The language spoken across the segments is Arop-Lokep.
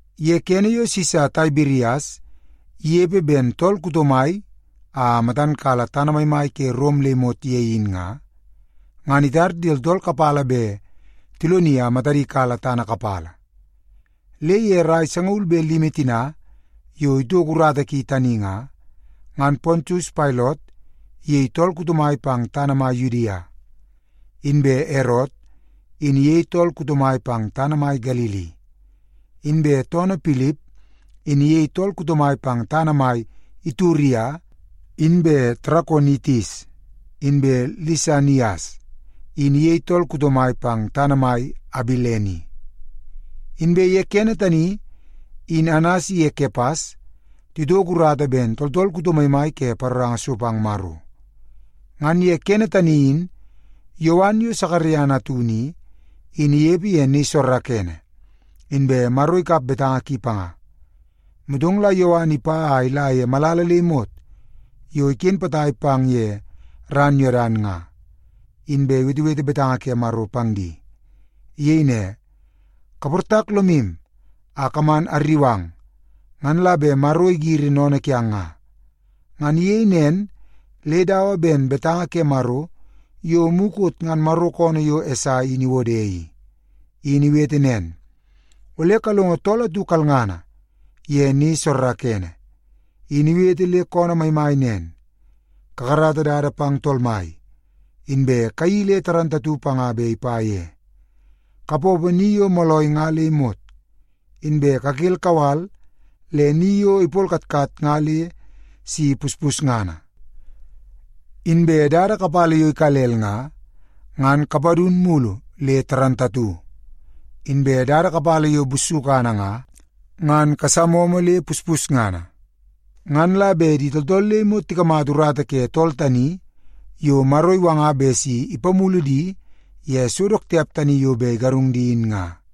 Ye kene yo Sisa Taibirias inepe ben tool kuto mai a matan kala tana maimai ke Rom le imot ye in nga, ngan itar di tooltool kapala bet tiloni a matadi kala tana kapala. Le ye rai sangaul be limi tina yo itoko urata ki tani nga, ngan Pontius Pailot iyei tool kuto mai pang tana mai Yudia, inbe Erot in iyei tool kuto mai pang tana mai Galili, inbe toonoo Pilip in iyei tool kuto mai pang tana mai Ituria inbe Tarakonitis, inbe Lisanias in iyei tool kuto mai pang tana mai Abilene. Inbe ye kene tani in Anas iye Kepas titoko urata ben tooltool kuto maimai ke paroranga so pang Maro. Ngan ye kene tani in Yowan yo Sakaria natunu i, in inepe ye ni soorookoonoo, inbe Maro ikap betanga ki panga. Motong la Yowan ipa a ila ye malala le imot yo iken potai pang ye ran Yodan nga, inbe iwetewete betanga ke Maro pang di. Iyei ne, “Kaportak lomu a kaman arriu ang, ngan la bet Maro igiri sennene kiang nga.” Ngan iyei nen le dawa ben betanga ke Maro yo mukot ngan Maro koonoo yo Esai in iwode i. In iwete nen, “Ole kalongo tool atu kalngana ye ni soorookoonoo, in iwete le koonoo maimai nen, ‘Kakarata dada pang Tool Mai, inbe kayeii le dundunngana panga bet ipa ye. Kapoopoo ni yo moolai nga le imot, inbe kakel kawal le ni yo ipolkatkat nga le si puspusngana. Inbe dada kapala yo ikalel nga, ngan kapadun mulu le dundunngana. Inbe dada kapala yo bussukana nga, ngan kasamomo le puspusngana. Ngan la bet di tooltool le imot tikamata urata ke tool tani yo Maro iwanga bet si ipamulu di ye so dook tiap tani yo bet igarung di in nga.’”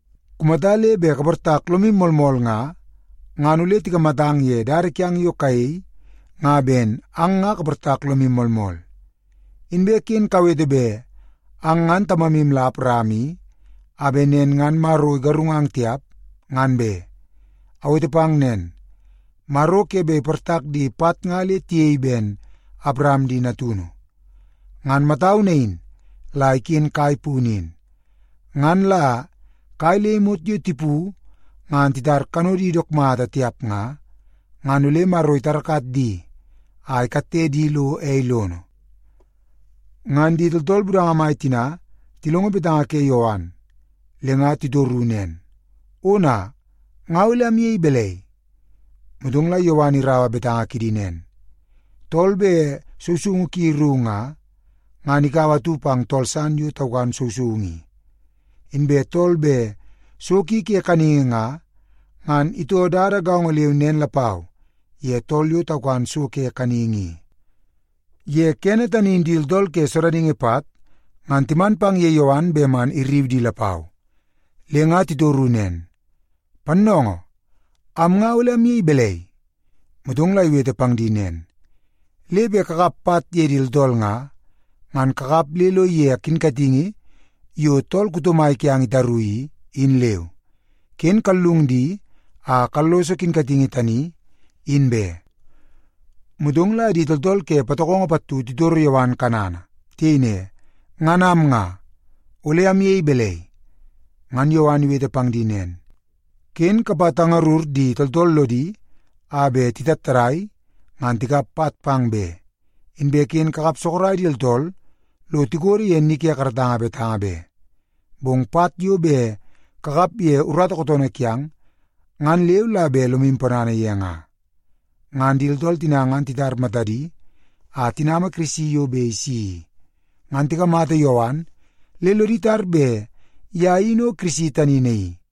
Kumata le bet kaportak lomu moolmool nga, ngan ole tikamatang ye dada kiang yo kayei nga ben ang nga kaportak lomu moolmool. Inbe ken kawete bet ang ngan tamamu la Awaram i, a bet nen ngan Maro igarungang tiap, ngan be. Awete pang nen, Maro ke bet iportak di pat nga le tiyei ben Awaram di natunu. Ngan matau nain la iken kai punu in. Ngan la kai le imot yo tipu ngan titar kanodi dook mata tiap nga, ngan ole Maro itarakat di a ikatte di lo ei lono.” Ngan di tooltool budanga mai tina tilongo betanga ke Yowan, le nga titoru nen, “Ona, nga ole amyei balai?” Motong la Yowan iraua betanga kidi nen, “Tool bet sousoungu ki ru nga, ngan ikaua atu pang tool san yo taukan sousoungu i. Inbe tool bet so ki ke kaningi nga, ngan itoo dada gaongo leu nen lapau ye tool yo taukan so ke kaningi i.” Ye kene tani in di tooltool ke sodaningi pat ngan timan pang ye Yowan bet man irriu di lapau. Le nga titoru nen, “Pannoongoo, am nga ole amyei balai?” Motong la iwete pang di nen, “Le bet kakap pat ye di tooltool nga, ngan kakap le lo ige kinkatingi yo tool kuto mai kiang itaru i, in leu. Ken kallung di a kalloso kinkatingi tani, in be.” Motong la di tooltool ke patokongo pattu titoro Yowan kanana. Tiyei ne, “Ngan am nga, ole amyei balai?” Ngan Yowan iwete pang di nen, “Ken kapatangarur di tooltool lodi a bet titattadai ngan tikap pat pang be, inbe ken kakap sorok di tooltool lo tikodo ye ni ke karatanga betanga be. Bong pat yo bet kakap ye urata kootoonoo kiang, ngan leu la bet lomu ponana ye nga.” Ngan di tooltool tina ngan titar matadi a tinama Kirisi yo bet isi i, ngan tikamata Yowan le lodi tar bet ye in o Kirisi tani naii.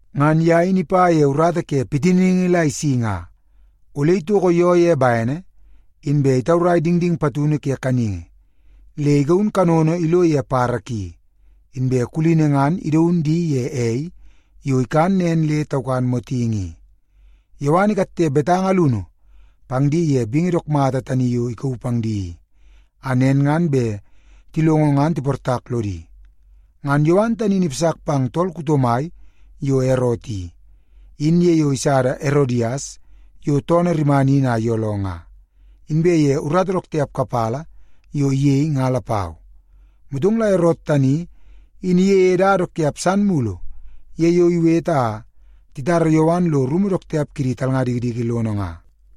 Ngan ye in ipa ye urata ke pitiningi la isi nga. Ole itoko yoo ye bene, inbe itaurai dingding patunu ke kaningi, le igaun kanono ilo ye badabada ki, inbe kulini ngan idaun di ye ei yo ikan nen le taukan motingi i.” Yowan ikatte betanga alunu pang di ye bingi dook mata tani yo ikauu pang di i, a nen ngan bet tilongo ngan tiportak lodi. Ngan Yowan tani in ipasak pang tool kuto mai yo Erot i, in ye yo isada Erodias yo toonoo rimana in a iyooloo nga, inbe ye urata dook tiap kapala yo iyei nga lapau. Motong la Erot tani in iyeie dada dook tiap san mulu ye yo iwete a titara Yowan lo rumu dook tiap kidi talnga dikidiki lono nga.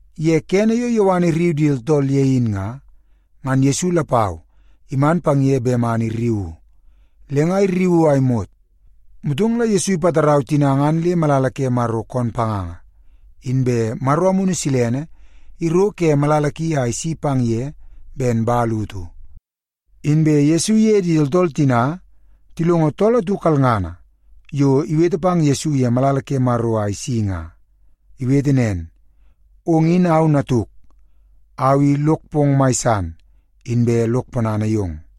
Ye kene yo Yowan irriu di tooltool ye in nga, ngan Yesu lapau iman pang ye bet man irriuu. Le nga irriuu a imot, motong la Yesu ipatarau tina ngan le malala ke Maro koon panganga. Inbe Maro Amunu Silene iro ke malala ki a isi pang ye ben man utu. Inbe tool atu kalngana iwetewete ye malala ke Maro a isi nen. Iyei ne, “Ong in au Natuk. Au i lok pong mai san, inbe lok ponana yong.”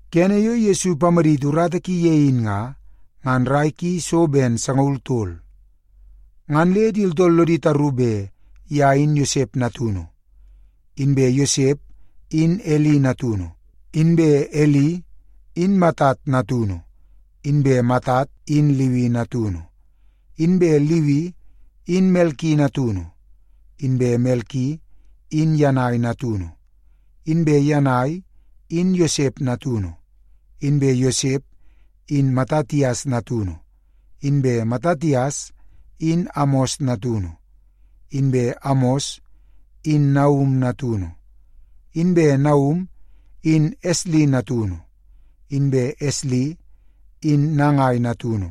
Kene yo Yesu ipamaditi urata ki ye in nga, ngan rai ki so ben sangaul tol. Ngan le di tooltool lodi taru bet ye in Yosep natunu, inbe Yosep in Eli natunu, inbe Eli in Matat natunu, inbe Matat in Liwi natunu, inbe Liwi in Melki natunu, inbe Melki in Yanai natunu, inbe Yanai in Yosep natunu, inbe Yosep in Matatias natunu, inbe Matatias in Amos natunu, inbe Amos in Naum natunu, inbe Naum in Esli natunu, inbe Esli in Nagai natunu,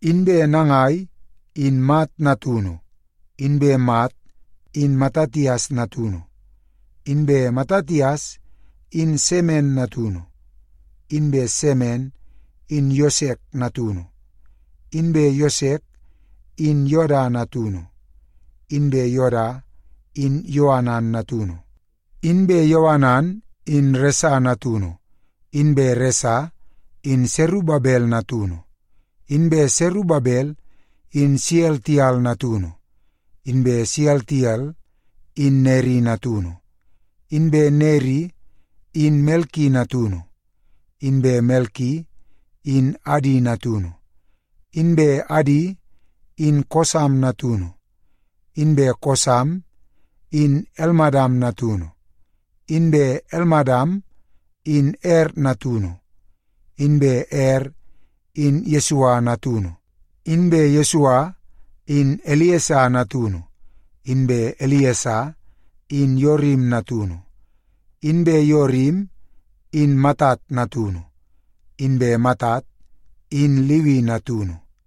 inbe Nagai in Mat natunu, inbe Mat in Matatias natunu, inbe Matatias in Semen natunu, inbe Semen in Yosek natunu, inbe Yosek in Yoda natunu, inbe Yoda in Yoanan natunu, inbe Yoanan in Resa natunu, inbe Resa in Serubabel natunu, inbe Serubabel in Sealtiel natunu, inbe Sealtiel in Neri natunu, inbe Neri in Melki natunu, inbe Melki in Adi natunu, inbe Adi in Kosam natunu, inbe Kosam in Elmadam natunu, inbe Elmadam in Er natunu, inbe Er in Yesua natunu, inbe Yesua in Eliesa natunu, inbe Eliesa in Yorim natunu, inbe Yorim in Matat natunu, inbe Matat in Liwi natunu,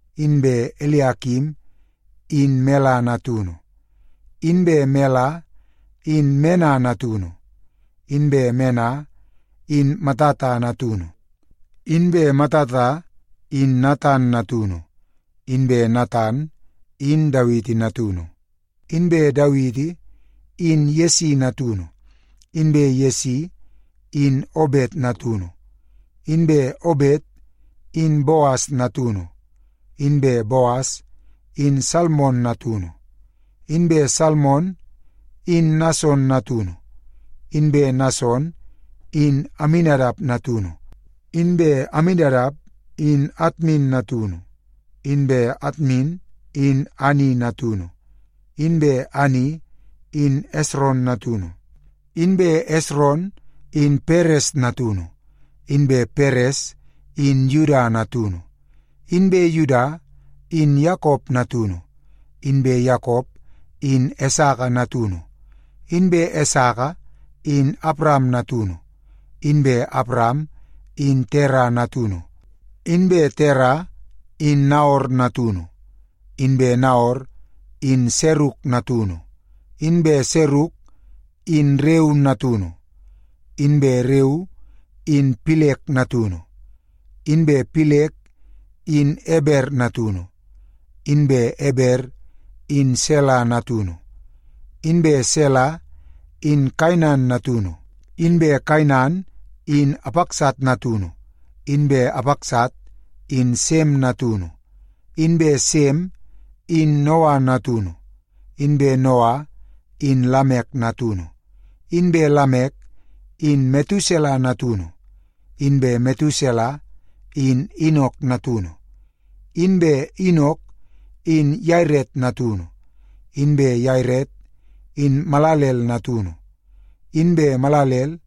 inbe Eliakim in Mela natunu, inbe Mela in Mena natunu, inbe Mena in Matata natunu, inbe Matata in Natan natunu, inbe Natan in Dawiti natunu, inbe Dawiti in Yesi natunu, inbe Yesi in Obet natunu, inbe Obet in Boas natunu, inbe Boas in Salmon natunu, inbe Salmon in Nason natunu, inbe Nason in Aminadap natunu, inbe Aminadap in Atmin natunu, inbe Atmin in Ani natunu, inbe Ani in Esron natunu, inbe Esron in Peres natunu, inbe Peres in Yuda natunu, inbe Yuda in Yakop natunu, inbe Yakop in Esaka natunu, inbe Esaka in Awaram natunu, inbe Awaram in Tera natunu, inbe Tera in Naor natunu, inbe Naor in Seruk natunu, inbe Seruk in Reu natunu, inbe Reu in Pilek natunu, inbe Pilek in Eber natunu, inbe Eber in Sela natunu, inbe Sela in Kainan natunu, inbe Kainan in Apaksat natunu, inbe Apaksat in Sem natunu, inbe Sem in Noa natunu, inbe Noa in Lamek natunu, inbe Lamek in Metusela natunu, inbe Metusela in Inok natunu, inbe Inok in Yaret natunu, inbe Yaret in Malalel natunu, inbe Malalel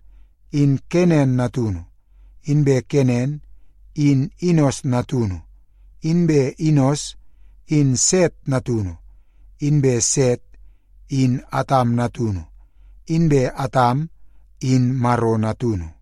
in Kenan natunu, inbe Kenan in Inos natunu, inbe Inos in Set natunu, inbe Set in Atam natunu, inbe Atam in Maro natunu.